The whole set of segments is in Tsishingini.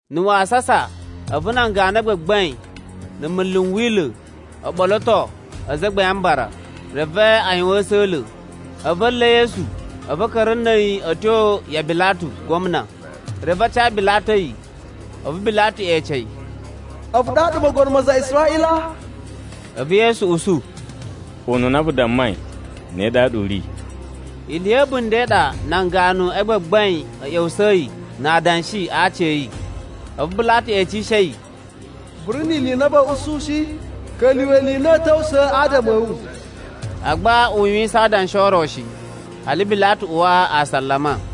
Na̱ wasasa a̱vu nan ganu a gbagbain na̱ munlu n Wila̱ o ɓoloto Azagbain a Mbara, reve a yuwan a̱sa̱la̱. A̱vu a̱ nla̱ Yesu, a̱vu a̱ ka̱ra̱ na̱ a̱yi a̱ tyo ya Bilatu Gwamna. Reve a ca Bilatu a̱yi. A̱vu Bilatu ece yi, “A̱vu ɗaɗa mogono ma aza a Israꞌila?” A̱vu Yesu usu, “Ununa vu dammai ne ɗaɗa u ri.” Ili ya̱ a̱bunda̱ i ɗa nan ganu a gbagbain a̱ ꞌya̱wusa̱yi na adanshi a aci a̱ yi. A̱vu Bilatu ecishe yi, “Vu ri ni ili i na va̱a̱ usu shi? Ka̱lyuwa̱ ili i na a̱a̱ ta̱wusa̱a̱ adama a̱ wu.” Agba u yuwisan adanshi o ro shi, hali Bilatu uwa asalama.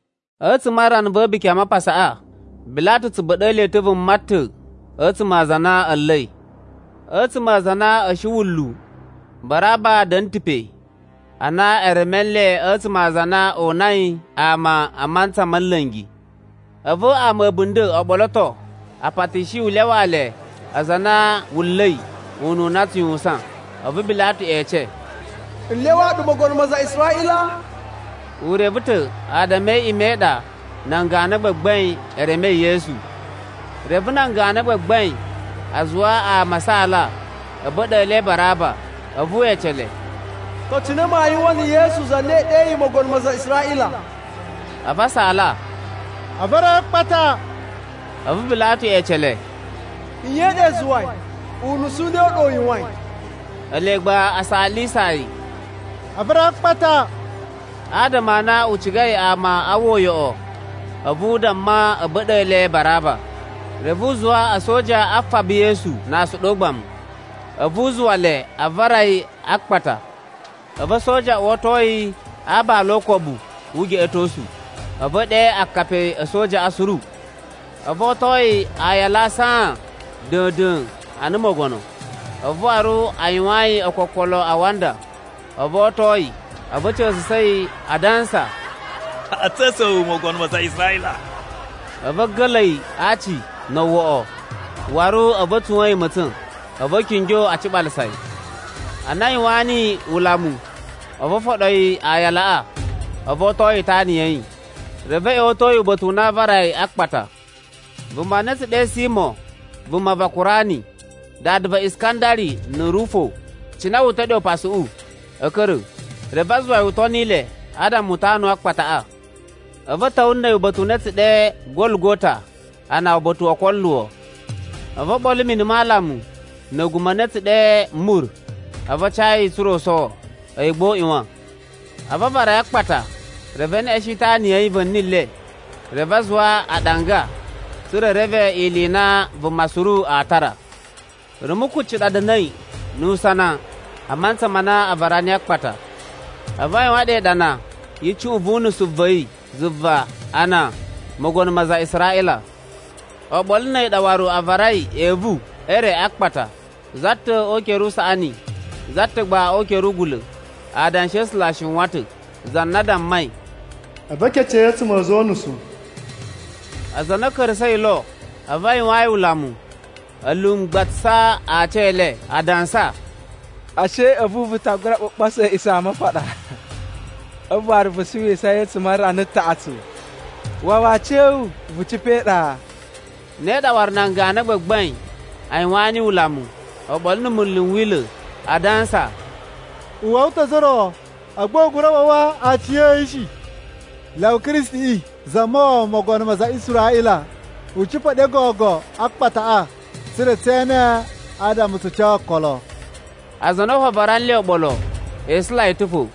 A̱tsuma̱ a rana va̱ A̱buki a Mapasaꞌa, Bilatu tsu ba̱ɗa̱a̱ le ta̱ vuma ta̱ a̱tsuma̱ a aza a na a̱ nla̱i. A̱tsuma̱ a aza a na a̱ shi wunlu Baraba da̱na̱ ta̱ pe ana e reme nle a̱tsuma̱ a aza a na o unai ama a mantsa ma̱ nla̱ngi. A̱vu ama a̱ a̱bunda̱ o ɓoloto a patishi yi u lyawaa le aza a na wu nla̱i ununa u tsu yuwusan. A̱vu Bilatu ece, “N lyawaa ɗu mogono ma aza a Israꞌila?” U reve ta̱ adama e iꞌima̱ i ɗa nan ganu a gbagbain e remei Yesu. Reve nan ganu a gbagbain a zuwa ama a saala a̱ ba̱ɗa̱a̱ le Baraba. A̱vu we ece le, “To cine maa yuwan na̱ Yesu za na i ɗeyi mogono ma aza a Israꞌila?” A̱vu a saala, “A vara yi a akpata.” A̱vu Bilatu ece le, “Nye i ɗa i zuwai? Unusu u ne u ɗa u yuwain?” Ele gba a saalisa yi, “A vara yi a akpata.” Adama a na u cigai ama aa uwwa uyoꞌo, a̱vu u damma a̱ ba̱ɗa̱a̱ le Baraba. Reve u zuwa a̱soja a faba Yesu na asuɗu o ugbamu, a̱vu u zuwa le a vara yi a akpata. A̱vu a̱soja a uwato yi a aabala o ukobu wu ugeꞌetosu, a̱vu e ɗe akapi a̱ a̱sojaꞌa suru. A̱vu o oto yi aayala saan da̱a̱n-da̱a̱n ana mogono, a̱vu waru a yuwaan yi ookokolo a awanda, a̱vu o oto yi. A̱vu a̱ ca̱sa̱sa̱ yi, a dansa, “A̱ ca̱sa̱ wu mogono ma aza a Israꞌila.” A̱vu a̱ ga̱la̱ yi a aaci no owoꞌo. Waru a̱vu a̱ tsuwa̱n yi ma̱tsa̱n. A̱vu a̱ kingyo a ciɓalasa yi. Ana a yuwaan niyi ulamu, a̱vu o foɗo yi aayalaꞌa, a̱vu o oto yi itana ya̱ yi. Reve a̱ ꞌya̱wa̱to yi uba̱ta̱ u na aa vara yi a akpata. Vuma na a̱ tsu ɗe Simo vuma va Kurani, dada va Iskandari na̱ Rufo, cina wu uta̱ ɗe upasuꞌu, a̱ ka̱ra̱. Reve a zuwa yi u toni le adama u tanu akpataꞌa. A̱vu a̱ ta̱wa̱ na̱ a̱yi uba̱ta̱ u na a̱ tsu ɗe Gologota, ana uba̱ta̱ wo okoluwo. A̱vu o ɓolo mini ma alamu na̱ a̱guma̱ a na a̱ tsu ɗe mur, a̱vu a ca yi tsa̱ra̱ u sowo. A̱yi gba u ꞌyuwan. A̱vu a vara yi a akpata, reve e neꞌeshen itana ya̱ yi va̱ni le. Reve a zuwa aɗanga, tsa̱ra̱ e reve ili i na vuma suru aa tara. Rumu kucci ɗa da̱na̱i nu usana a mantsa ma na a vara niyi a akpata. A̱vu a yuwan ɗe iɗana yi icuꞌun vu unusu wa̱ yi zuva ana: Mogono ma aza a Israꞌila. Oɓolo na̱ a̱yi ɗa waru a varai evu e re a akpata. Za ta̱ o ukere usaꞌani za ta̱ gba o ukere ugula̱. [ Adanshi a̱ A̱sula̱ a shiwan ta̱, za na dammai: “A̱vu e kece yi a̱tsuma̱ a̱ a̱za̱ o unusu.”] Aza a na a̱ ka̱ra̱sa̱i lo, a̱vu a yuwaan yi ulamu a lumgbatsasa aci e le, a dansa, “Ashe a̱vu vu ta gura ɓuɓoso A̱a̱ꞌisamapaɗa, a̱vu waru vu suwisa yi a̱tsuma̱ a rana taꞌatsu. Wawa aciya̱wu, vu cipa̱ e iɗa.” Ne ɗa waru nan ganu a gbagbain a yuwaan niyi ulamu oɓolo na̱ munlu n Wila̱, a dansa, “U wawa ta̱ ozo o ro, agba u gura wawa aciya̱yi shi. Lyawa Kristiꞌi Zamawawa, mogono ma aza a Israꞌila, u cipa̱ ɗe gogo a akpataꞌa, tsa̱ra̱ tsee ene adama tsu ca okolo.” Aza a na fo a vara nle oɓolo, e isula yi ta̱ fo.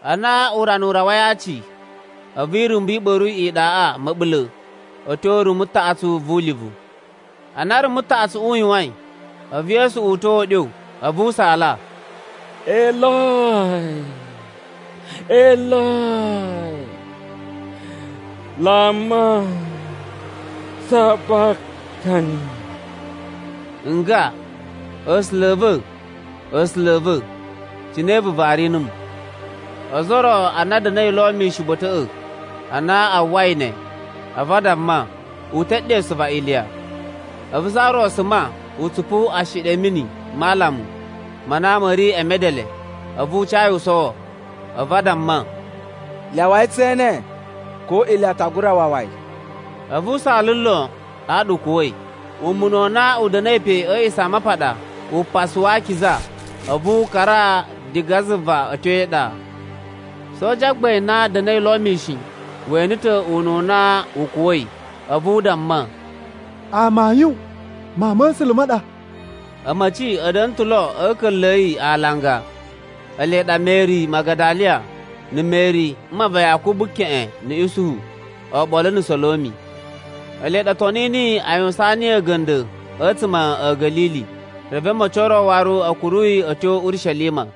Ana urana u rawai a aci, a̱vu irumbu i ɓa̱ru iɗaꞌa ma̱ɓula̱ a̱ tyo rumu taꞌatsu vu ulivu. Ana rumu taꞌatsuꞌu u yuwain, a̱vu Yesu uta̱a̱ uɗyo, a̱vu u saala, “Eloi, Eloi, lama sabaktani.” Nga, “A̱sula̱ a̱ va̱, A̱sula̱ a̱ va̱, cine vu vari numu?” Ozo o ro ana a̱ da̱na̱i lo mishin uba̱ta̱ꞌa̱, ana a uwwai ne, a̱vu a damma, u te ɗesu va Iliya. A̱vu za ro suma u tsupu ashiɗi a̱ mini ma alamu ma na ma̱ ri e medele, a̱vu u ca yi u sowo. A̱vu a damma, “Lyawai tse ene ko Iliya ta gura wawa yi.” A̱vu u saala lon, ɗaɗa u kuwa̱i. Umuna u na u da̱na̱i pe a̱ A̱a̱ꞌisamapaɗa Upasa wa Akiza, a̱vu u kara diga zuva a̱ tyo e iɗa. Soja gbain na da̱na̱i lo mishin, we ene ta̱ ununa u kuwa̱i. A̱vu u damma, “Amayun Mawun ma̱ A̱sula̱ ma ɗa.” A̱ma̱ci a̱ da̱na̱ ta̱ lo a̱ a̱ka̱nla̱ a̱ yi alanga, ele ɗa Meri Magadaliya, na̱ Meri mma va Yakubu keꞌen na̱ Isuhu, oɓolo na̱ Solomi. Ele ɗa o toni niyi a yuwusaan yi a̱ga̱nda̱ a̱tsuma̱ a̱ Ga̱lili, reve a̱ma̱ci o ro waru a̱ kuru yi a̱ tyo Urishelima.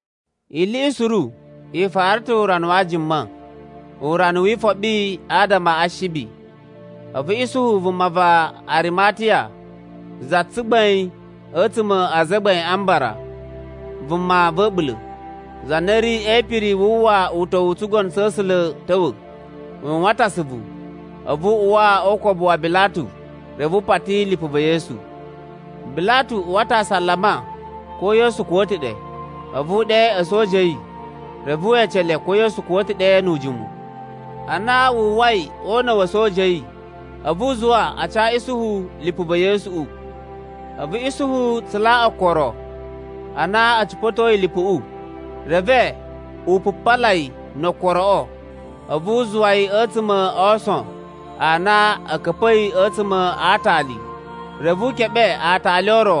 Ili i suru i fara ta̱ urana wa Ajuma, Urana wi Ifoɓi adama a Ashibi. A̱vu Isuhu vuma va Arimatiya za tsugbain a̱tsuma̱ a Azagbain a Mbara, vuma va̱ a̱ɓula̱, za na ri e ipiri wu uwwa uta̱wu u tsugono tsa̱ A̱sula̱ ta̱wa̱, u yuwan ta̱ asuvu. A̱vu u uwa o ukobu wa Bilatu, reve u pati lipu va̱ Yesu. Bilatu uwa ta̱ asalama ko Yesu kuwa̱ ta̱ ɗe. A̱vu u ɗe a̱soja a̱ yi, reve we ece le ko Yesu kuwa̱ ta̱ ɗe nu ujimu. Ana wu uwwai o una̱ wa̱ a̱soja a̱ yi, a̱vu u zuwa a ca Isuhu lipu va̱ Yesuꞌu. A̱vu Isuhu tsula okoro. Ana a̱ cipa̱toi lipuꞌu, reve u pupala yi no okoroꞌo. A̱vu u zuwa yi a̱tsuma̱ a aason a na a̱ ka̱pa̱i a̱tsuma̱ a aatali. Reve u keɓe aatali o ro,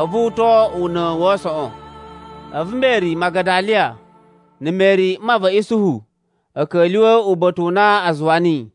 a̱vu u to una̱ wa aasoꞌon. A̱vu Meri Magadaliya na̱ Meri mma va̱ Isuhu a̱ ka̱lyuwa̱ uba̱ta̱ u na a zuwa niyi.